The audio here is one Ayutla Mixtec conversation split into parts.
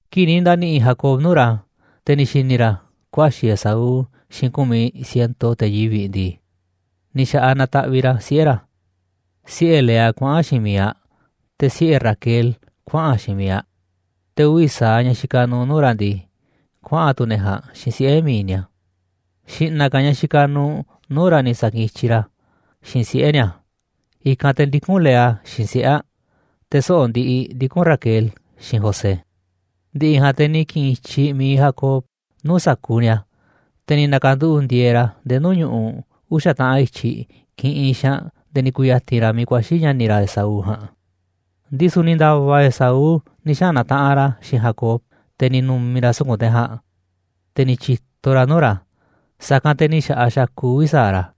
Kii̱ꞌ ni̱ nda̱ni̱ꞌi̱ Jacob nuu̱ꞌ ra̱, te̱ ni̱ xi̱ni̱ ra̱ kuaxi̱ Esaú xiinꞌ ku̱miꞌ ciento te̱ yivi̱ꞌ ndii, ni̱ xa̱ꞌaꞌ nataꞌviꞌ ra̱ siꞌe̱ ra̱, siꞌe̱ Lea kuaꞌa̱n xiinꞌ miiꞌ aꞌ, te̱ siꞌe̱ Raquel kuaꞌa̱n xiinꞌ mi̱iꞌ aꞌ, te̱ uvi̱ sa̱aꞌ ñaꞌ xikaꞌ nuuꞌ nuu̱ꞌ ra̱ ndii, kuaꞌa̱n tu̱ ne̱ ja̱a̱nꞌ xiinꞌ siꞌe̱ mi̱iꞌ ni̱a̱. Xi̱ꞌna̱ ka̱ ñaꞌ xikaꞌ nuuꞌ nuu̱ꞌ ra̱ ni̱ sa̱kiꞌinꞌ i̱tyiꞌ ra̱ xiinꞌ siꞌe̱ ni̱a̱, i̱kanꞌ te̱ ndikún Lea xiinꞌ siꞌe̱ aꞌ, te̱ soꞌo̱ꞌ ndiꞌiꞌ ndikún Raquel xiinꞌ José. Ndi̱ꞌi̱ ja̱a̱nꞌ te̱ ni̱ ki̱ꞌi̱n i̱tyi mi̱iꞌ Jacob nuu̱ꞌ sa̱kuuꞌ ni̱a̱, te̱ ni̱ na̱ka̱nduꞌu̱ꞌ ndi̱e̱e̱ ra̱ nde̱e̱ nuu̱ꞌ ñu̱ꞌuꞌ uxa̱ taꞌan i̱tyiꞌ kiꞌinꞌ xaanꞌ nde̱e̱ ni̱ ku̱ya̱ti̱n ra̱ miiꞌ ku̱a̱xi̱ ña̱ni̱ ra̱ Esaú ja̱a̱nꞌ. Ndisu̱ ni̱ nda̱va̱ Esaú ni̱ xaꞌa̱n na̱taꞌanꞌ ra̱ xiinꞌ Jacob, te̱ ni̱ nu̱mi̱ ra̱ suku̱nꞌ te̱ ja̱a̱nꞌ, te̱ ni̱ tyi̱to ra̱ nuu̱ꞌ ra̱, sa̱kanꞌ te̱ ni̱ xa̱ꞌaꞌ xakuꞌ uvi̱ sa̱aꞌ ra̱.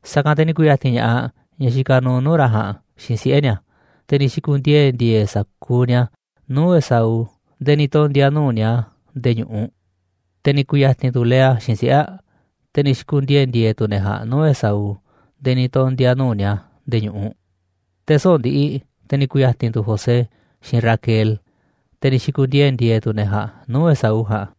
Sa̱kanꞌ te̱ ni̱ ku̱ya̱ti̱n ña̱ꞌaꞌ ñaꞌ xikaꞌ nuuꞌ nuu̱ꞌ ra̱ ja̱a̱nꞌ xiinꞌ siꞌe̱ ni̱a̱, te̱ ni̱ xi̱ku̱ndiee̱ ndi̱e̱e̱ sa̱kuuꞌ ni̱a̱ nuu̱ꞌ Esaú nde̱e̱ ni̱ tondi̱a̱ nuu̱ꞌ ni̱a̱ nde̱e̱ ñu̱ꞌuꞌ. Te̱ ni̱ ku̱ya̱ti̱n tu̱ Lea xiinꞌ siꞌe̱ aꞌ, te̱ ni̱ xi̱ku̱ndiee̱ ndi̱e̱e̱ tu̱ ne̱ ja̱a̱nꞌ nuu̱ꞌ Esaú nde̱e̱ ni̱ tondi̱a̱ nuu̱ꞌ ni̱a̱ nde̱e̱ ñu̱ꞌuꞌ. Te̱ soꞌo̱ꞌ ndiꞌiꞌ te̱ ni̱ ku̱ya̱ti̱n tu̱ José xiinꞌ Raquel, te̱ ni̱ xi̱ku̱ndiee̱ ndi̱e̱e̱ tu̱ ne̱ ja̱a̱nꞌ nuu̱ꞌ Esaú ja̱a̱nꞌ.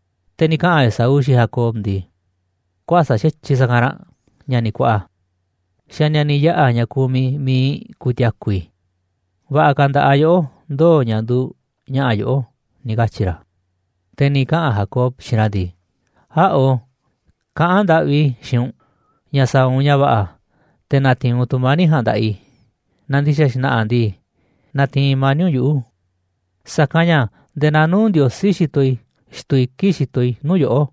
Te̱ ni̱ kaꞌa̱n Esaú xiinꞌ Jacob ndii: ―Kuäsa̱ꞌ xa̱tyiꞌ sa̱kanꞌ ranꞌ, ña̱ni̱ kuaꞌa, xa̱ ni̱a̱ni̱ yaꞌa̱ ña̱ kumiꞌ mi̱iꞌ i̱ ku̱ti̱a̱ku̱ i̱. Va̱ꞌa̱ ka̱ nda̱ꞌaꞌ yoꞌó ndoo̱ ña̱ nduuꞌ ña̱ꞌa̱ yoꞌó ―ni̱ katyi̱ ra̱. Te̱ ni̱ kaꞌa̱n Jacob xiinꞌ ra̱ ndii: ―Äꞌo̱, kaꞌán ndaꞌvi i̱ xiinꞌ u̱nꞌ ña̱ sa̱a̱ u̱nꞌ ña̱ va̱ꞌa̱ te̱ na̱ti̱i̱n u̱nꞌ tu̱mani̱ꞌ ja̱a̱nꞌ nda̱ꞌaꞌ i̱, naaꞌ ndi̱xa̱ xna̱ꞌa̱ ndii, natiinꞌ mani̱ꞌ u̱nꞌ yuꞌu̱, sa̱kanꞌ ña̱ nde̱e̱ naa nuu̱ꞌ Ndiosí xitoꞌ i̱ xtuu i̱ kii̱ꞌ xitoꞌ i̱ nuu̱ꞌ yoꞌó,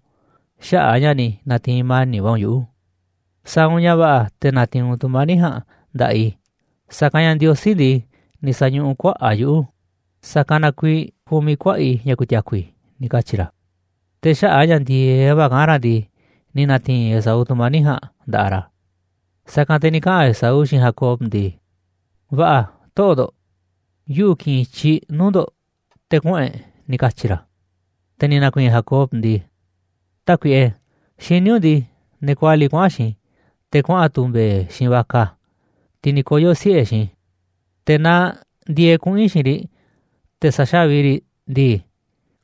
xaꞌa̱ꞌ a̱ ña̱ ni̱ na̱ti̱i̱n mani̱ꞌ va̱ u̱nꞌ yuꞌu̱. Sa̱a̱ u̱nꞌ ña̱ va̱ꞌa̱ te̱ na̱ti̱i̱n u̱nꞌ tu̱mani̱ꞌ ja̱a̱nꞌ nda̱ꞌaꞌ i̱, sa̱kanꞌ ña̱ Ndiosí ndii, ni̱ sa̱ñuꞌuꞌ kuaꞌa̱ꞌ a̱ yuꞌu̱, sa̱kanꞌ na kuiiꞌ kumiꞌ kuaꞌa̱ꞌ i̱ ña̱ ku̱ti̱a̱ku̱ i̱ ―ni̱ katyi̱ ra̱. Te̱ xaꞌa̱ꞌ a̱ ña̱ ndi̱e̱eꞌ va̱ kaꞌán ra̱ ndii, ni̱ na̱ti̱i̱n Esaú tu̱mani̱ꞌ ja̱a̱nꞌ nda̱ꞌaꞌ ra̱. Sa̱kanꞌ te̱ ni̱ kaꞌa̱n Esaú xiinꞌ Jacob ndii: ―Va̱ꞌa̱, toꞌo̱ꞌ ndo̱ꞌ, yuꞌu̱ ki̱ꞌi̱n i̱tyiꞌ nuu̱ꞌ ndo̱ꞌ te̱ kuꞌu̱n e̱ꞌ ―ni̱ katyi̱ ra̱. Te̱ ni̱ na̱ku̱i̱i̱n Jacob ndii: ―Tákuiꞌe, xiní u̱nꞌ ndii, ne̱ kualiꞌ kuaꞌa̱n xiinꞌ i̱, te̱ kuaꞌa̱n tu̱ mbe̱e̱ xiinꞌ vaca, tiꞌ ni̱ koyo̱ siꞌe̱ xiinꞌ i̱, te̱ naaꞌ ndi̱e̱eꞌ kuꞌu̱n i̱ xiinꞌ riꞌ te̱ sa̱xávi i̱ riꞌ ndii,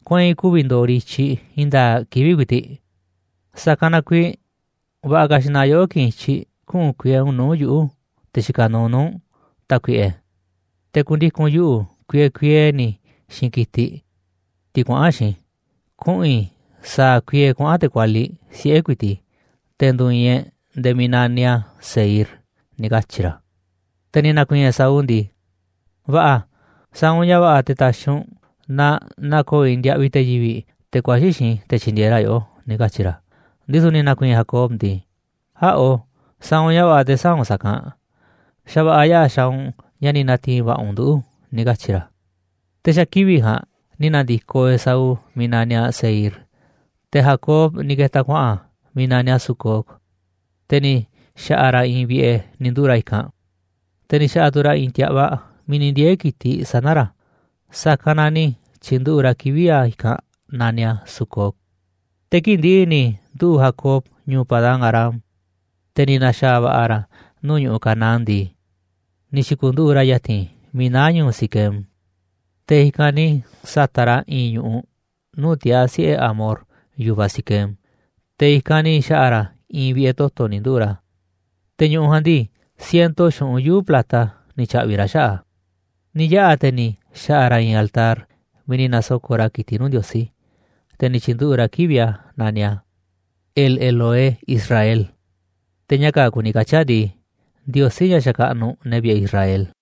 kueinꞌ ku̱vi̱ ndo̱o̱ riꞌ i̱tyiꞌ i̱i̱n nda̱a̱ꞌ kivi̱ꞌ ku̱i̱ti̱ꞌ. Sa̱kanꞌ na kuiiꞌ va̱ꞌa̱ ka̱ xi̱ꞌna̱ yoꞌó ki̱ꞌi̱n i̱tyiꞌ kuꞌu̱n kuiee u̱nꞌ nuu̱ꞌ yuꞌu̱, te̱ xikaꞌ nuuꞌ nuu̱ꞌ u̱nꞌ, tákuiꞌe, te̱ ku̱ndiku̱n yuꞌu̱ kuiee kuiee ni̱ xiinꞌ ki̱tiꞌ, tiꞌ kuaꞌa̱n xiinꞌ i̱, kuꞌu̱n i̱ sa̱a̱ kuiee kuaꞌa̱n te̱ kualiꞌ siꞌe̱ ku̱i̱ti̱ꞌ i̱, te̱ ndu̱u̱ i̱i̱n e̱ꞌ nde̱e̱ miiꞌ naniꞌ a̱ Seir ―ni̱ katyi̱ ra̱. Te̱ ni̱ na̱ku̱i̱i̱n Esaú ndii: ―Va̱ꞌa̱, sa̱a̱ u̱nꞌ ña̱ va̱ꞌa̱ te̱ ta̱xi̱ u̱nꞌ na na̱ko̱o̱ i̱ ndiaꞌviꞌ te̱ yivi̱ꞌ, te̱ kuaxi̱ xiinꞌ i̱ te̱ tyi̱ndi̱e̱eꞌ ra̱ yoꞌó ―ni̱ katyi̱ ra̱. Ndisu̱ ni̱ na̱ku̱i̱i̱n Jacob ndii: ―Äꞌo̱, sa̱a̱ u̱nꞌ ña̱ va̱ꞌa̱ te̱ sä̱a̱ u̱nꞌ sa̱kanꞌ, xa̱ va̱ꞌa̱ yaꞌa̱ xaaꞌ u̱nꞌ ña̱ ni̱ na̱ti̱i̱n va̱ꞌa̱ u̱nꞌ nduꞌu̱ ―ni̱ katyi̱ ra̱. Te̱ xa̱ kivi̱ꞌ ja̱a̱nꞌ ni̱ na̱ndi̱koꞌ Esaú miiꞌ naniꞌ a̱ Seir. Te̱ Jacob ni̱ ke̱ta̱ kuaꞌa̱n miiꞌ naniꞌ a̱ Sucot, te̱ ni̱ xa̱ꞌa̱ ra̱ i̱i̱n vi̱ꞌe̱ ni̱ nduꞌu̱ꞌ ra̱ i̱kanꞌ, te̱ ni̱ xa̱ꞌa̱ tu̱ ra̱ i̱i̱n ti̱a̱ꞌvaꞌ miiꞌ ni̱ ndiee̱ ki̱tiꞌ sana̱ ra̱, sa̱kanꞌ na ni̱ tyi̱nduꞌu̱ꞌ ra̱ kivi̱ꞌ a̱ i̱kanꞌ naniꞌ a̱ Sucot. Te̱ kii̱ꞌ ndi̱ꞌi̱ ni̱ nduꞌu̱ꞌ Jacob ñu̱u̱ Padán-arám, te̱ ni̱ na̱xa̱a̱ va̱ꞌa̱ ra̱ nuu̱ꞌ ñu̱ꞌuꞌ Canaán ndii, ni̱ xi̱ku̱nduꞌu̱ꞌ ra̱ ya̱ti̱n miiꞌ naá ñu̱u̱ Siquem. Te̱ i̱kanꞌ ni̱ sa̱ta̱ꞌ ra̱ i̱i̱n ñu̱ꞌuꞌ nuu̱ꞌ tiaa̱ siꞌe̱ Hamor, yu̱vaꞌ Siquem, te̱ i̱kanꞌ ni̱ xa̱ꞌa̱ ra̱ i̱i̱n vi̱ꞌe̱ toto̱ ni̱ nduꞌu̱ꞌ ra̱. Te̱ ñu̱ꞌuꞌ ja̱a̱nꞌ ndii, ciento xu̱ꞌunꞌ yuu̱ꞌ plata ni̱ tya̱ꞌvi̱ ra̱ xaꞌa̱ꞌ a̱. Ni̱ yaꞌa̱ te̱ ni̱ xa̱ꞌa̱ ra̱ i̱i̱n altar miiꞌ nasoko̱ꞌ ra̱ ki̱tiꞌ nuu̱ꞌ Ndiosí, te̱ ni̱ tyi̱nduꞌu̱ꞌ ra̱ kivi̱ꞌ a̱ naniꞌ a̱: El-Elohé-Israel, te̱ ña̱ kaa̱ꞌ kuni katyi̱ a̱ ndii, Ndiosí, ña̱ xakaꞌnuꞌ ne̱ vi̱ꞌe̱ Israel.